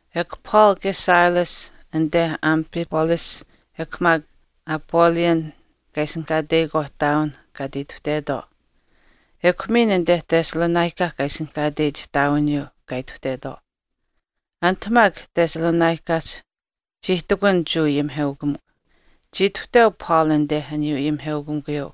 Ekw Paul kaye Silas anite Amphipolis ekw maak Apollonia kaa ishinihkaateyikwaauh ihtaawin kaa ati ituhtetwaau. Ekw miin anite Thessalonica kaa ishinihkaateyich ihtaawiniyuu kaa ituhtetwaau. Anit maak Thessalonicahch chii ihtakun Jewa ayimiheukamikw. Chii ituhteu Paul anite aniyuu ayimiheukamikuyuu,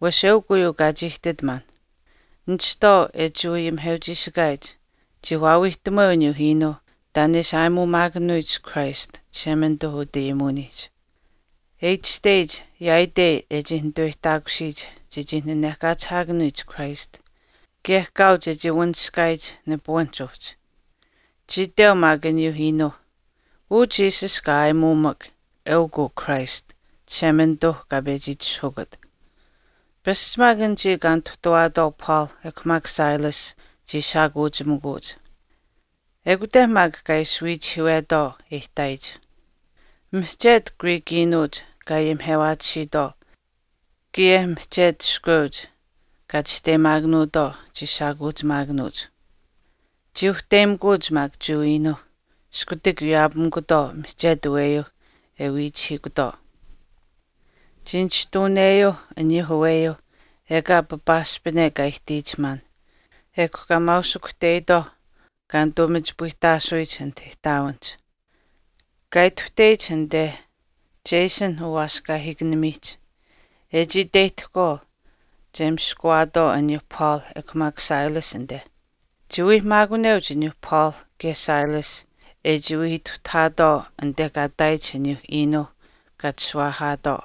wesh eukw uyuu kaa chii ihtit maan. Nishtwaau e Jewa ayimiheuchiishikaayich chii waawiihtamuweu aniyuu iinuu taan e ishi aayimuumaakanuyich Christ Chishemanituu utayimuwiniihch, E itashteyich yaaitei e chii nituweyihtaakusiyich chechii nanehkachihaakanuyich Christ, kaye kaau chechii wanishkaayich nipuwinihch uhchi. Chii iteu maak aniyuu iinuuh, “Uu Jesus kaa aayimuumak, eukw uu Christ, Chishemanituu kaa pechi itishahukut.” Pasch maak anichii kaa nituhtuwaatwaau Paul ekw maak Silas chii shaakuuchimikuuch, ekute maak kaa ishi wiichihiiwetwaau e ihtaayich. Mihchetu Greek iinuuch kaa ayimihewaatisiitwaau, kaye mihchetu iskweuch kaa chisteyimaakanuutwaau chii shaakuuchimaakanuuch. Chii uhteyimikuuch maak Jewa iinuuh, iskutak wiyaapamikutwaau mihchetu aweyuuh e wiichihiikutwaau. Chii nishtuuneyuu aniyuuh aweyuuh ekaa papaaspine kaa ihtiyich maan, ekw kaa maausikuhteyitwaau kaa nituu machipayihtaasuyich anit ihtaawinihch. Kaa ituhteyich anite Jason uwaaskaahiikanimiihch, e chii iteyihtahkwaau che miskawaatwaau aniyuu Paul ekw maak Silas anite. Chii wii maakuneuch aniyuu Paul kaye Silas e chii wii ituhtahaatwaau anite kaa ihtaayich aniyuu iinuu kaa chishuwaahaatwaau.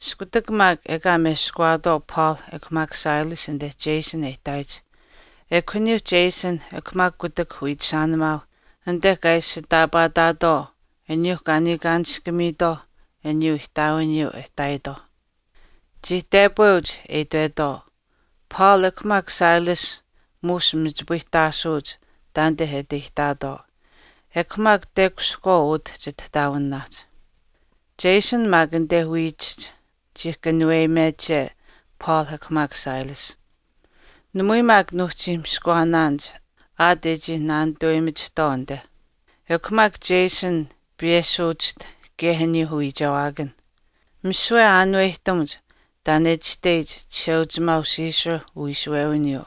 Iskutak maak ekaa meskawaatwaau Paul ekw maak Silas anite Jason e ihtaayich ekw aniyuu Jason ekw maak kutak wiichishaanimaauh anite kaa ishitaapaataatwaau aniyuu kaa niikaanishkamiitwaauh aniyuu ihtaawiniyuu e ihtaayitwaauh. Chii tepweuch e itwetwaau, “Paul ekw maak Silas muush machipayihtaasuuch taanite e ati ihtaatwaau, ekw maak tekushihkwaau utah chitihtaawinaahch. Jason maak anite wiichihch chii kanuweyimeche Paul ekw maak Silas. Namui maak nuuhchi miskawaanaanich aat e chii naanituweyimachihtwaau anite. Ekw maak Jason piyeshuwachiht kaye aniyuuh uwiichewaakanh. Misiwe aanuwehtamuch taan e itashteyich Chisheuchimaau Caesar uwiishuwewiniyuu,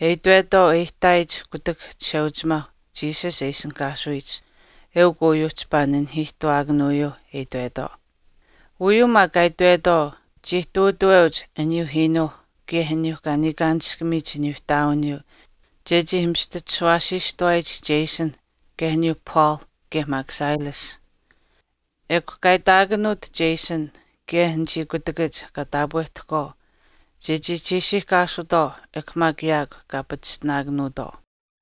e itwetwaau e ihtaayich kutak Chisheuchimaau Jesus e ishinihkaasuyich,” eukw uyuu chipaa nanihiihtawaakanuyuu e itwetwaau. Uyuu maak kaa itwetwaau chii ihtuutaweuch aniyuu iinuu, kaye aniyuu kaa niikaanishkamiyich aniyuu ihtaawiniyuu chechii mistachishuwaasiistuwaayich Jason kaye aniyuu Paul kaye maak Silas. Ekw kaa itaakanuut Jason kaye anichii kutakach kaa taapwehtahkwaau chechii chiishiihkaasutwaau ekw maak yaakw kaa pachishtinaatwaau.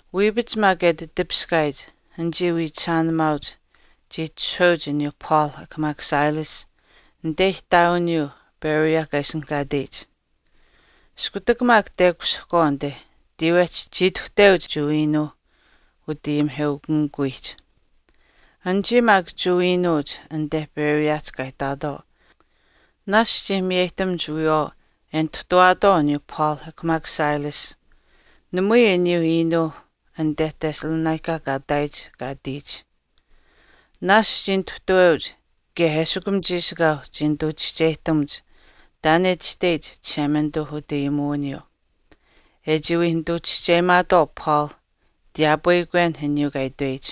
Wiipach maak e ati tipiskaayich, anichii wiichishaanimaauch chii itishahweuch aniyuu Paul ekw maak Silas anite ihtaawiniyuu Berea kaa ishinihkaateyich. Iskutak maak tekushihkwaau anite tiiwehch chii ituhteuch Jewa iinuuh utayimiheukamikuwiihch. Anichii maak Jewa iinuuch anite Bereahch kaa ihtaatwaau naashch chii miyeyihtamuch wiyawaau e nituhtuwaatwaau aniyuu Paul ekw maak Silas namui aniyuu iinuu anite Thessalonica kaa ihtaayich kaa ihtiyich. Naashch chii nituhtuweuch kaye eshikum chiishikaau chii nituu chischeyihtamuch taan e itashteyich Chishemanituu utayimuwiniyuu, e chii wii nituu chischeyimaatwaau Paul tiyaapweyikwen aniyuu kaa itweyich.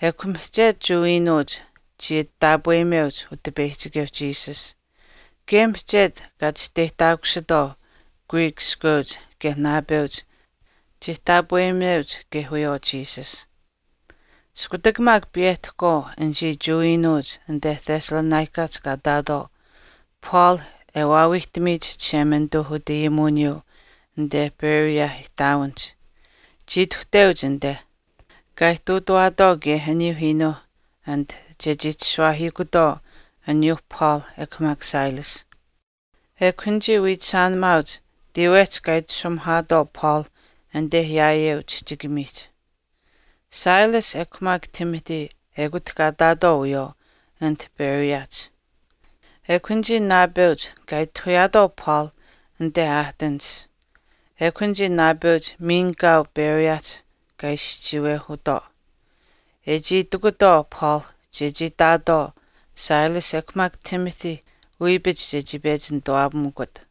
Ekw mihchetu Jewa iinuuch chii ati taapweyimeuch Utipeyihchikeu Jesus, kaye mihchetu kaa chisteyihtaakusitwaau Greek iskweuch kaye naapeuch chii taapweyimeuch kaye wiyawaau Jesus. Iskutak maak piyehtahkwaau anichii Jewa iinuuch anite Thessalonicahch kaa ihtaatwaau Paul e waawiihtamiyich Chishemanituu utayimuwiniyuu anite Berea ihtaawinihch, chii ituhteuch anite, kaa ihtuutawaatwaau kaye aniyuu iinuu anit chechii chishuwaahiikutwaau aniyuu Paul ekw maak Silas. Ekw anichii wiichishaanimaauch tiiwehch kaa itashumuhaatwaau Paul anite yaayeu chihchikamiihch. Silas ekw maak Timothy ekut kaa ihtaatwaau wiyawaau anit Bereahch. Ekw anichii naapeuch kaa itahuyaatwaau Paul anite Athensihch. Ekw anichii naapeuch miin kaau Bereahch kaa ishi chiiwehutwaau, e chii itikutwaau Paul chechii itaatwaau Silas ekw maak Timothy wiipach chechii pechi nituwaapamikut.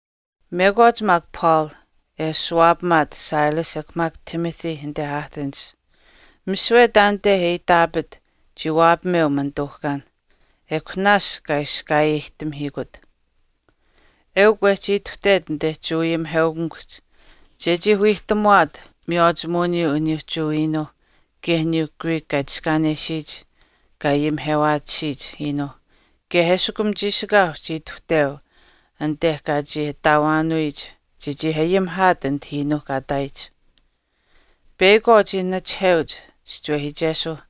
Mekwaach maak Paul e ashuwaapamaat Silas ekw maak Timothy anite Athensihch, misiwe taanite e iitaapit chii waapameu manituuhkaan, ekw naashch kaa iskaayeyihtamahiikut. Eukw wehchii ituhtet anite Jewa ayimiheukamikuhch chechii wiihtamuwaat miywaachimuwiniyuu aniyuu Jewa iinuuh kaye aniyuu Greek kaa itiskaanesiyich kaa ayimihewaatisiyich iinuu kaye eshikum chiishikaau chii ituhteu anite kaa chii ataawaanuyich chechii ayimihaat anit iinuuh kaa ihtaayich. Peyakwaau chii nachiheuch chischinuhamaachesuuh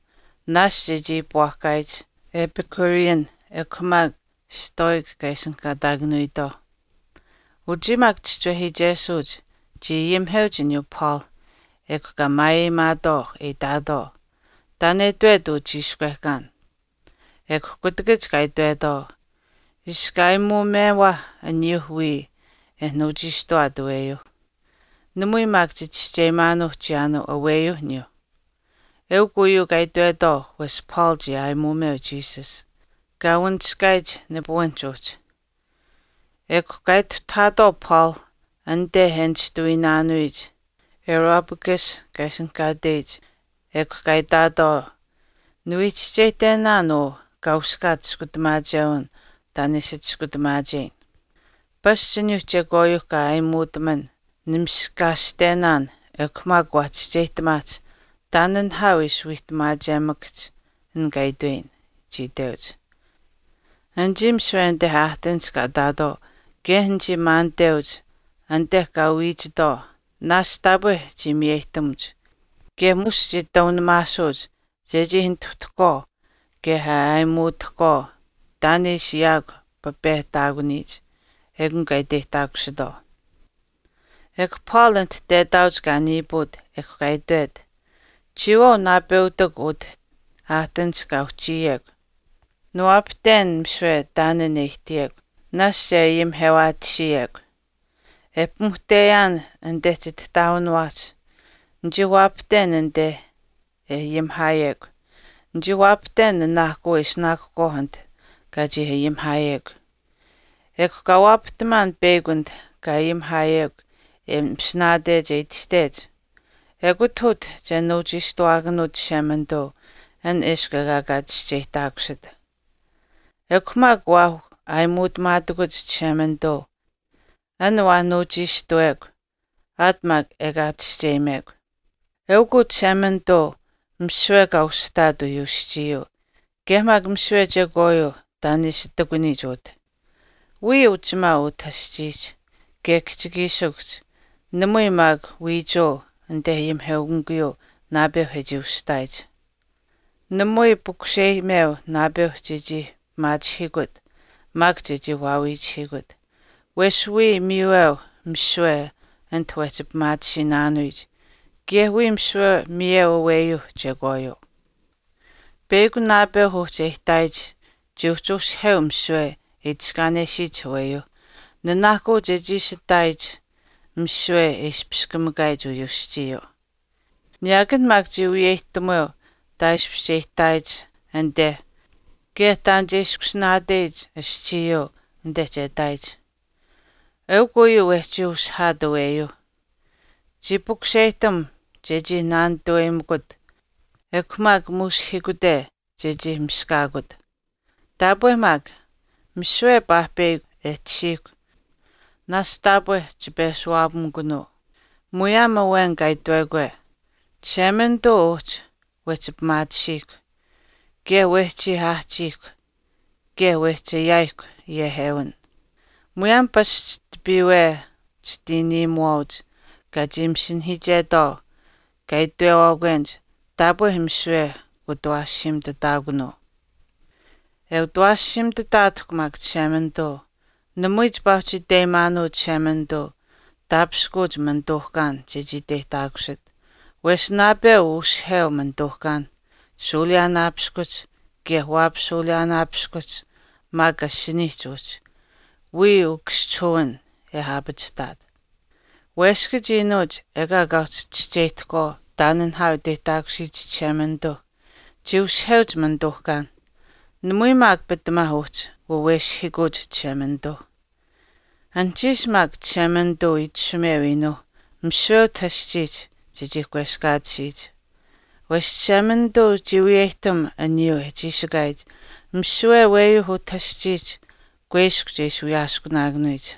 naashch e chii iipwaahkaayich Epicurean ekw maak Stoic kaa ishinihkaataakanuyitwaauh. Uchii maak chischinuhamaachesuuch chii ayimiheuch aniyuu Paul ekw kaa maayeyimaatwaau e itaatwaau, “Taan e itwet uu chiishkwehkaan.” Ekw kutakach kaa itwetwaau, “Iska aayimuumewaah aniyuu wiya e nuuchiishtuwaat aweyuu, namui maak chichischeyimaanuu chiyaanuu aweyuu aniyuu.” Eukw uyuu kaa itwetwaau wesh Paul chii aayimuumeyuu Jesus, kaa wanishkaayich nipuwinihch uhchi. Ekw kaa ituhtahaatwaau Paul anite e nishtuwiinaanuyich Areopagus kaa ishinihkaateyich ekw kaa itaatwaau, “Niwii chischeyihtenaan uu kaa uskaach chiskutamaachewin taan e ishi chiskutamaacheyin. Pasch aniyuu chekwaayuu kaa aayimuutaman nimiskaashtenaan ekw maak waa chischeyihtamaahch taan nihaau e ishi wiihtamaachemakahch an kaa itweyin,” chii itweuch. Anichii misiwe anite Athensihch kaa ihtaatwaau kaye anichii maaniteuch anite kaa wiichitwaau naashch taapwe chii miyeyihtamuch kaye muush chii taunamaasuuch chechii nituhtahkwaau kaye e ayimitutahkwaau taan e ishi yaakw papehtaakuniyich, ekun kaa iteyihtaakusitwaau. Ekw Paul anit tetaauch kaa niipuut ekw kaa itwet, “Chiyawaau naapeutikw utah athensihch kaa uhchiyekw, niwaapahten misiwe taan an e ihtiyekw, naashch e ayimihewaatisiyekw. E pimuhteyaan anite chitihtaawiniwaahch, nichii waapahten anite e ayimihaayekw. Nichii waapahten nanaahkuu e ishinaakuhkwaauh anit kaa chii ayimihaayekw. Ekw kaa waapahtamaan peyakw anit kaa ayimihaayekw e masinaatech e itashtech, ‘Ekut utah che nuuchiishtuwaakanuut Chishemanituu an eshkw ekaa chischeyihtaakusit.’ Ekw maak waa aayimuutamaatakuch Chishemanituu an waa nuuchiishtuwekw aat maak ekaa chischeyimekw.” “Eukw uu Chishemanituu misiwe kaa usihtaat uyuu aschiiyuu kaye maak misiwe chekwaayuu taan e ishi ihtakuniyich utah, wiya uchimaau utah aschiihch kaye kihchikiishikuhch namui maak wiichuu anite ayimiheukamikuyuu naapeu e chii ushihtaayich. Namui pukuseyimeu naapeuh chechii pimaachihiikut maak chechii waawiichihiikut, wesh wiya miiweu misiwe anit wehchi pimaatisiinaanuyich kaye wiya misiwe miyeu aweyuuh chekwaayuu. Peyakw naapeuh uhchi e ihtaayich chii uhchi ushiheu misiwe e itiskaanesiyich aweyuuh nanaahkuu chechii ishi ihtaayich misiwe e ispichiskamikaayich uyuu aschiiyuu. Niyaakan maak chii wiyeyihtamuweu taaishpish che ihtaayich anite kaye taan che ishkusinaateyich aschiiyuu anite che ihtaayich. Eukw uyuu wehchii ushihaat aweyuuh, chii pukuseyihtam chechii naanituwaapamikut ekw maak muushihiikute chechii miskaakut. Taapwe maak, misiwe paahpeyakw e tashiihkw naashch taapwe chipeshuwaapamikunuu. Muyaam awen kaa itwekwe, ‘Chishemanituu uhchi wehchi pimaatisiihkw, kaye wehchii aahchiihkw kaye wehchi ayaayihkw yehewin.’ Muyaam pasch tipiiwe chitiiniimuwaauch kaa chii masinahiichetwaau kaa itwewaakwenich, ‘Taapwe misiwe kuutawaashiimitutaakunuu.’” “E utawaashiimitutaatahkw maak Chishemanituu, namui chipaa uhchi iteyimaanuu Chishemanituu taapishkuuch manituuhkaan chechii iteyihtaakusit wesh naapeu ushiheu manituuhkaan shuuliyaanaapiskuhch kaye waapashuuliyaanaapiskuhch maak asiniihch uhchi wiya ukaschihuwin e aapachihtaat. Weskach iinuuch ekaa uhchi chischeyihtahkwaau taan nihaau e iteyihtaakusiyich Chishemanituu chii ushiheuch manituuhkaan, namui maak pitamaa uhchi waweshihiikuuch Chishemanituu. Anuhchiish maak Chishemanituu itashumeu iinuuh misiwe utah aschiihch chechii kweskaatisiyich. Wesh Chishemanituu chii wiyeyihtam aniyuu e chiishikaayich misiwe aweyuu utah aschiihch kuiskw che ishi wiyaaskunaakanuyich.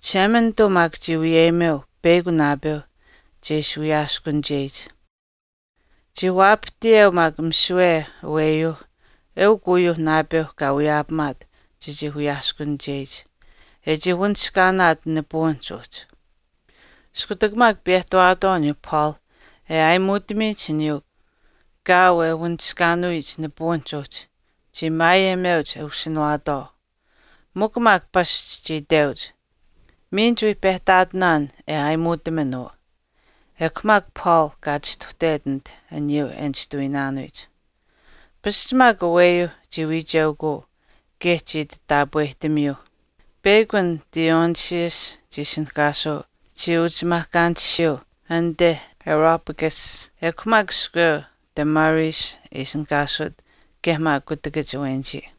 Chishemanituu maak chii wiyeyimeu peyakw naapeu che ishi wiyaaskunicheyich, chii waapahtiyeu maak misiwe aweyuu eukun uyuu naapeu kaa wiyaapamaat chechii wiyaaskunicheyich, e chii wanishkaanaat nipuwinihch uhchi.” Iskutak maak piyehtawaatwaau aniyuu Paul e aayimuutamiyich aniyuu kaau e wanishkaanuyich nipuwinihch uhchi, chii maayeyimeuch e ushinawaatwaau, mikw maak pasch chii iteuch, “Miin chiwii pehtaatinaan e aayimuutaman uu.” Ekw maak Paul kaa chistuhtet anit aniyuu e nishtuwiinaanuyich. Pasch maak aweyuu chii wiicheukuu kaye chii ati taapwehtamiyuu. Peyakw an Dionysius chii ishinihkaasuu chii uchimaahkaanishiyuu anite Areopagus, ekw maak iskweu Damaris e ishinihkaasut kaye maak kutakach awenichii.